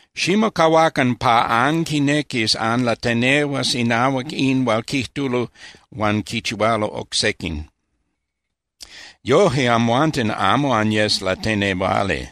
’Ximocahuacan pa anquinequis anlatenehuas inahuac in hual quijtulo huan quichihualo oc sequin. Yoje amhuanten amo anyes latenehuali.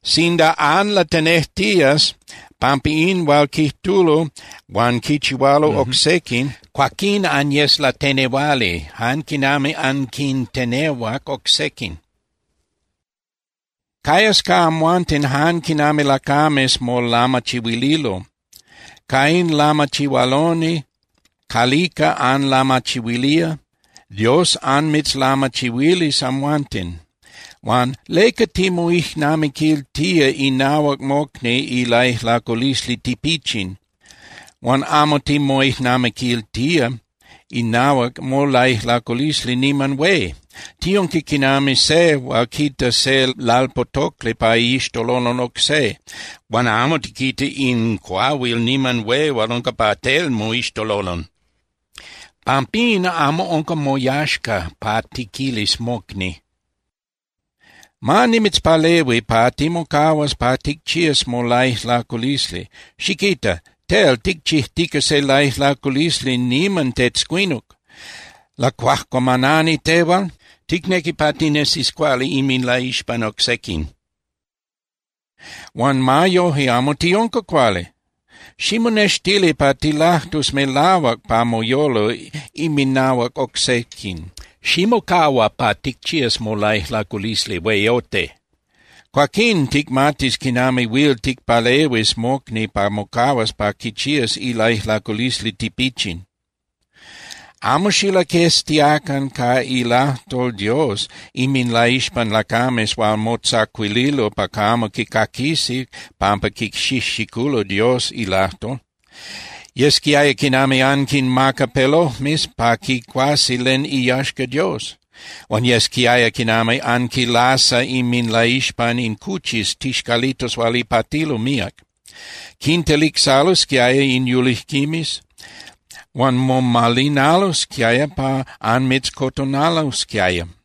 Sinda anlatenejtías pampa in hual quijtulo huan quichihualo oc sequin, cuaquín anyes latenehuali jan quinami anquintenehuac oc sequin. Cayas ca amhuanten jan quinami lacames molamachihuililo. Ca in lamachihualoni calica anlamachihuilía, Dios anmitzlamachihuilis amhuanten. Huan ¿leca timoijnamiquiltía inahuac mocni ilaijlaculisli tipichin, huan amo timoijnamiquiltía inahuac molaijlaculisli niman hué? Tiunca quinami se hual quita se lalpotocli pa iixtololon oc se, huan amo tiquita in cuahuil niman hué hual unca pa tel moixtololon. Pampín, amo unca moyaxca pa tiquilis mocni: “Ma nimitzpalehui pa timocahuas pa ticchías molaijlaculisli.” ¡Xiquita! Tel ticchijtica se laijlaculisli niman tetzcuinuc. ¡Lacuajcuamanani tehual! Ticnequi pa tinesis cuali inminlaixpan oc sequin, huan ma yoje amo tiunca cuali. Ximonextili pa tilajtus melahuac pa moyolo inminahuac oc sequin. Ximocahua pa ticchías molaijlaculisli hueyote, cuaquín ticmatis quinami huil ticpalehuis mocni pa mocahuas pa quichías ilaijlaculisli tipichin. ’Amo xilaqueztiacan ca ilajtol Dios inminlaixpan lacames hual motzacuililo pa camo quicaquisi pampa quixijxiculo Dios ilajtol. Yesquiaya quinami anquimaca pelojmes pa quicuasi len iyaxca Dios, huan yesquiaya quinami anquinlasa inminlaixpan in cuchis tixcalitos hual ipatilo míac. Quintelicsalosquiaya in yulijquimes huan momalinalosquiaya pa anmitzcotonalosquiaya.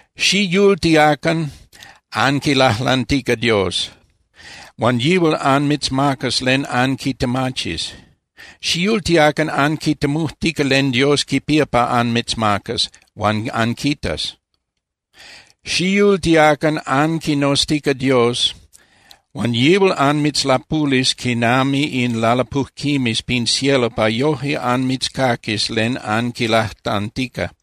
’Xiyultiacan anquilajlantica Dios, huan yihual anmitzmacas len anquitemachis. Xiyultiacan anquitemujtica len Dios quipía pa anmitzmacas, huan anquitas. Xiyultiacan anquinoztica Dios huan yihual anmitzlapulis quinami in lalapujquimes pin cielo pa yoje anmitzcaquis len anquilajlantica.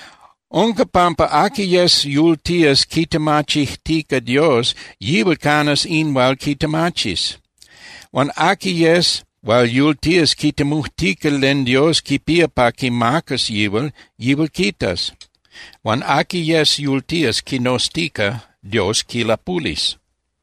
Unca pampa aqui yes yultías quitemachijtica Dios, yihual canas in hual quitemachis. Huan aqui yes hual yultías quitemujtica len Dios quipía pa quimacas yihual, yihual quitas. Huan aqui yes yultías quinoztica, Dios quilapulis.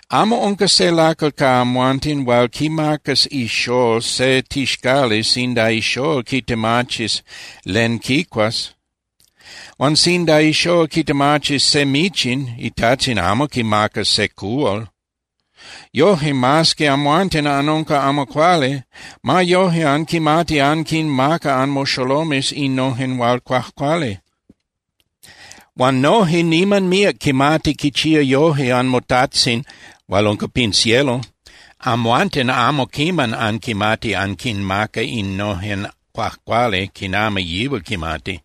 ’Amo unca se lacal ca amhuanten hual quimacas ixól se tixcali sinda ixól quitemachis len quicuas. Huan sinda ixól quitemachis se michin, itajtzin amo quimacas se cuhual. Yoje, mas que amhuanten anunca amo cuali, ma yoje anquimati anquinmaca anmoxolomes innojen hual cuajcuali. Huan noje niman míac quimati quichía yoje anmoTajtzin hual unca pin cielo. Amhuanten amo quiman anquimati anquinmaca innojen cuajcuali quinami yihual quimati.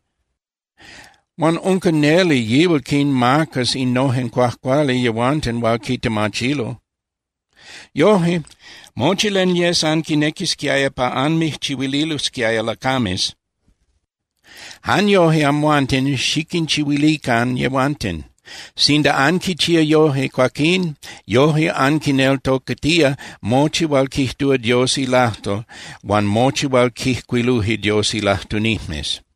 Huan unca neli yihual quinmacas innojen cuajcuali yehuanten hual quitemachilo. ’Yoje, mochi len yes anquinequisquiaya pa anmijchihuililosquiaya lacames, jan yoje amhuanten xiquinchihuilican yehuanten. Sinda anquichía yoje, cuaquín yoje anquineltocatía mochi hual quijtúa Dios ilajtol huan mochi hual quijcuiluje Dios ilajtunijmes.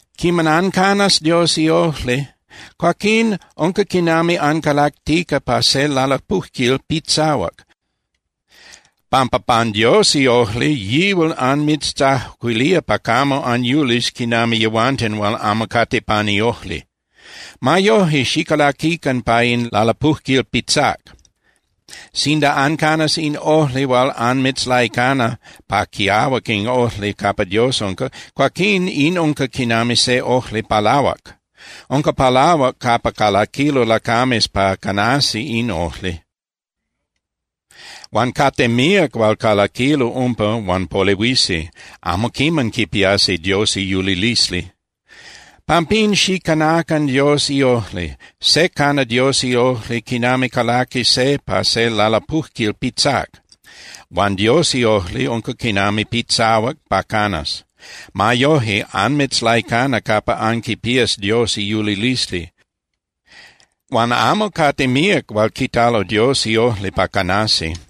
’Quiman ancanas Dios iojli, cuaquín unca quinami ancalactica pa se lalapujquil pitzahuac, pampa pan Dios iojli yihual anmijtzacuilía pa camo anyulis quinami yehuanten hual amo cate pan iojli. Ma yoje, xicalaquican pa in lalapujquil pitzác. Sinda ancanas in ojli hual anmitzlaicana pa quiahuac in ojli capa Dios unca, cuaquín in unca quinami se ojli palahuac. Unca palahuac capa calaquilo lacames pa canasi in ojli. Huan cate míac hual calaquilo umpa huan polehuisi, amo quiman quipiasi Dios iyulilisli. Pampín, xicanacan Dios iojli. Se cana Dios iojli quinami calaqui se pa se lalapujquil pitzác, huan Dios iojli unca quinami pitzahuac pa canas. Ma yoje anmitzlaicana capa anquipías Dios iyulilisli. Huan amo cate míac hual quitalo Dios iojli pa canasi.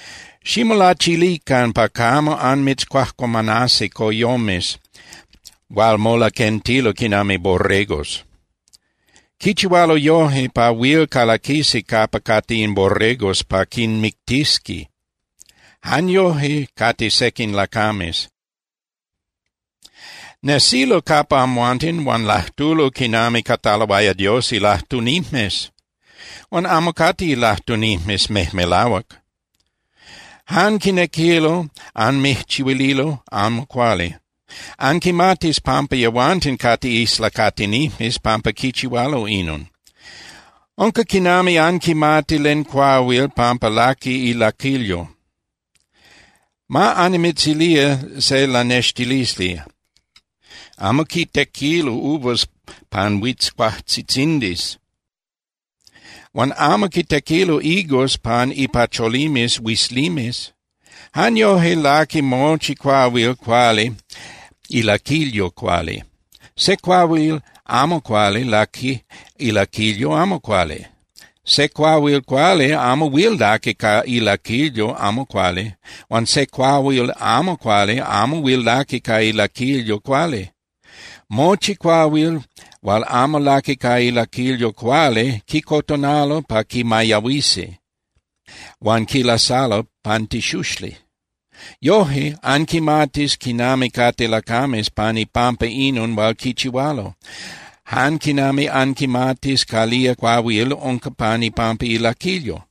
’Ximolachilican pa camo anmitzcuajcuamanasi coyomes hual molaquentilo quinami borregos. Quichihualo yoje pa huil calaquisi capa cate in borregos pa quinmictisi. Jan yoje cate sequin lacames. Nesilo capa amhuanten huan lajtulo quinami cataloaya Dios ilajtunijmes, huan amo cate ilajtunijmes mejmelahuac. Jan quinequilo anmijchihuililo amo cuali. Anquimatis pampa yehuanten cate islacatinijmes pampa quichihualo inon. Unca quinami anquimati len cuahuil pampa laqui ilaquilyo. Ma annimitzilía se lanextilisli: Amo quitequilo uvas pan huitzcuajtzitzindis huan amo quitequilo higos pan ipacholimes huizlimes. Jan yoje laqui mochi cuahuil cuali ilaquilyo cuali. Se cuahuil amo cuali laqui ilaquilyo amo cuali. Se cuahuil cuali amo huil laqui ca ilaquilyo amo cuali. Huan se cuahuil amo cuali amo huil laqui ca ilaquilyo cuali. Mochi cuahuil hual amo laqui ca ilaquilyo cuali quicotonalo pa quimayahuisi, huan quilasalo pan tixuxli. Yoje, anquimatis quinami cate lacames pan ipampa inon hual quichihualo, jan quinami anquimatis calía cuahuil unca pan ipampa ilaquilyo.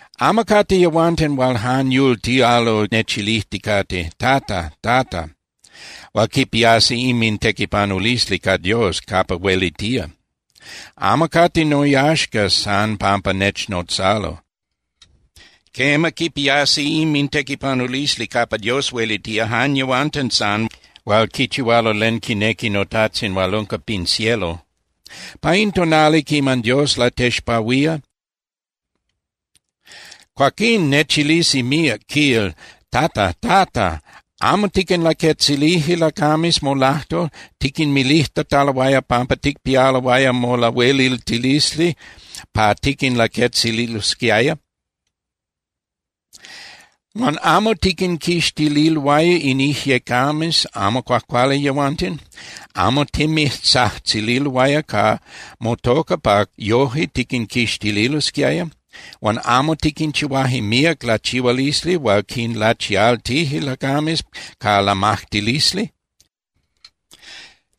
’Amo cate yehuanten hual jan yultialo nechilijticate: “Tata, Tata”, hual quipiasi inmintequipanulisli ca Dios capa huelitía. Amo cate noyaxca san pampa nechnotzalo. Quema, quipiasi inmintequipanulisli capa Dios huelitía jan yehuanten san hual quichihualo len quinequi noTajtzin hual unca pin cielo. Pa in tonali quiman Dios latexpahuía, cuaquín nechilisi míac, quil: “Tata, Tata, ¿amo tiquinlaquetzilije lacames molajtol, tiquinmilijtataloaya pampa ticpialoaya molahueliltilisli pa tiquinlaquetzililosquiaya? Huan ¿amo tiquinquixtililoaya in ijyecames amo cuajcuali yehuanten? ¿Amo timijtzajtzililoaya ca motoca pa yoje tiquinquixtililosquiaya? Huan ¿amo tiquinchihuaje míac lachihualisli hual quinlachialtije lacames ca lamajtilisli?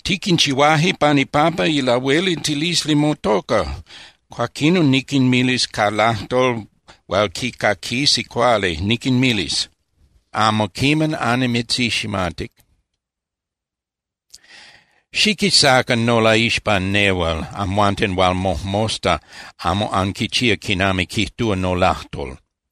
Tiquinchihuaje pan ipampa ilahueliltilisli motoca.” Cuaquinon niquinmilis ca lajtol hual quicaquisi cuali, niquinmilis: “Amo quiman annimitziximatic. Xiquisacan nolaixpan nehual, amhuanten hual mojmosta amo anquichía quinami quijtúa nolajtol.”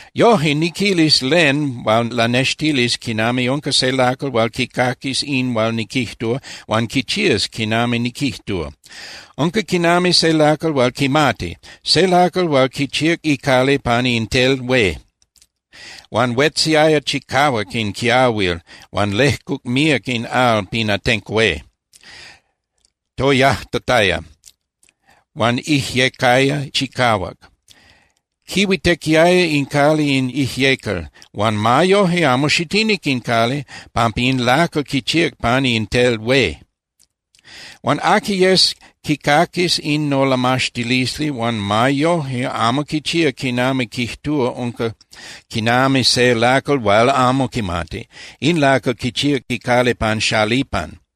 ’Yoje, niquilis len hual lanextilis quinami unca se lacal hual quicaquis in hual niquijtúa huan quichías quinami niquijtúa. Unca quinami se lacal hual quimati, se lacal hual quichíac icali pani in tel hué. Huan huetziaya chicahuac in quiahuil huan lejcuc míac in al pin atenco hué. Toyajtataya, huan ijyecaya chicahuac. Quihuitequiaya in cali in ijyecal, huan ma yoje amo xitinic in cali, pampa in lacal quichíac pani in tel hué. Huan aqui yes quicaquis in nolamaxtilisli huan ma yoje amo quichía quinami quijtúa unca quinami se lacal hual amo quimati. In lacal quichíac icali pan xalipan.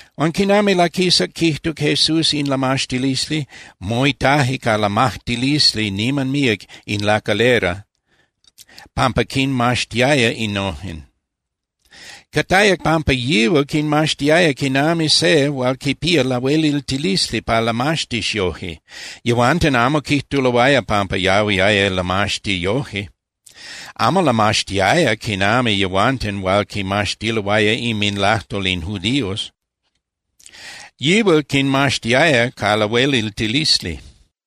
Huan quiman laquisac quijtuc Jesús in lamaxtilisli, moitaje ca lamajtilisli niman míac in lacalera pampa quinmaxtiaya innojen. Cataya pampa yihual quinmaxtiaya quinami se hual quipía lahueliltilisli pa lamaxtis yoje. Yehuanten amo quijtuloaya pampa yahuiaya lamaxti yoje. Amo lamaxtiaya quinami yehuanten hual quimaxtiloaya inminlajtol in judíos. Yihual quinmaxtiaya ca lahueliltilisli.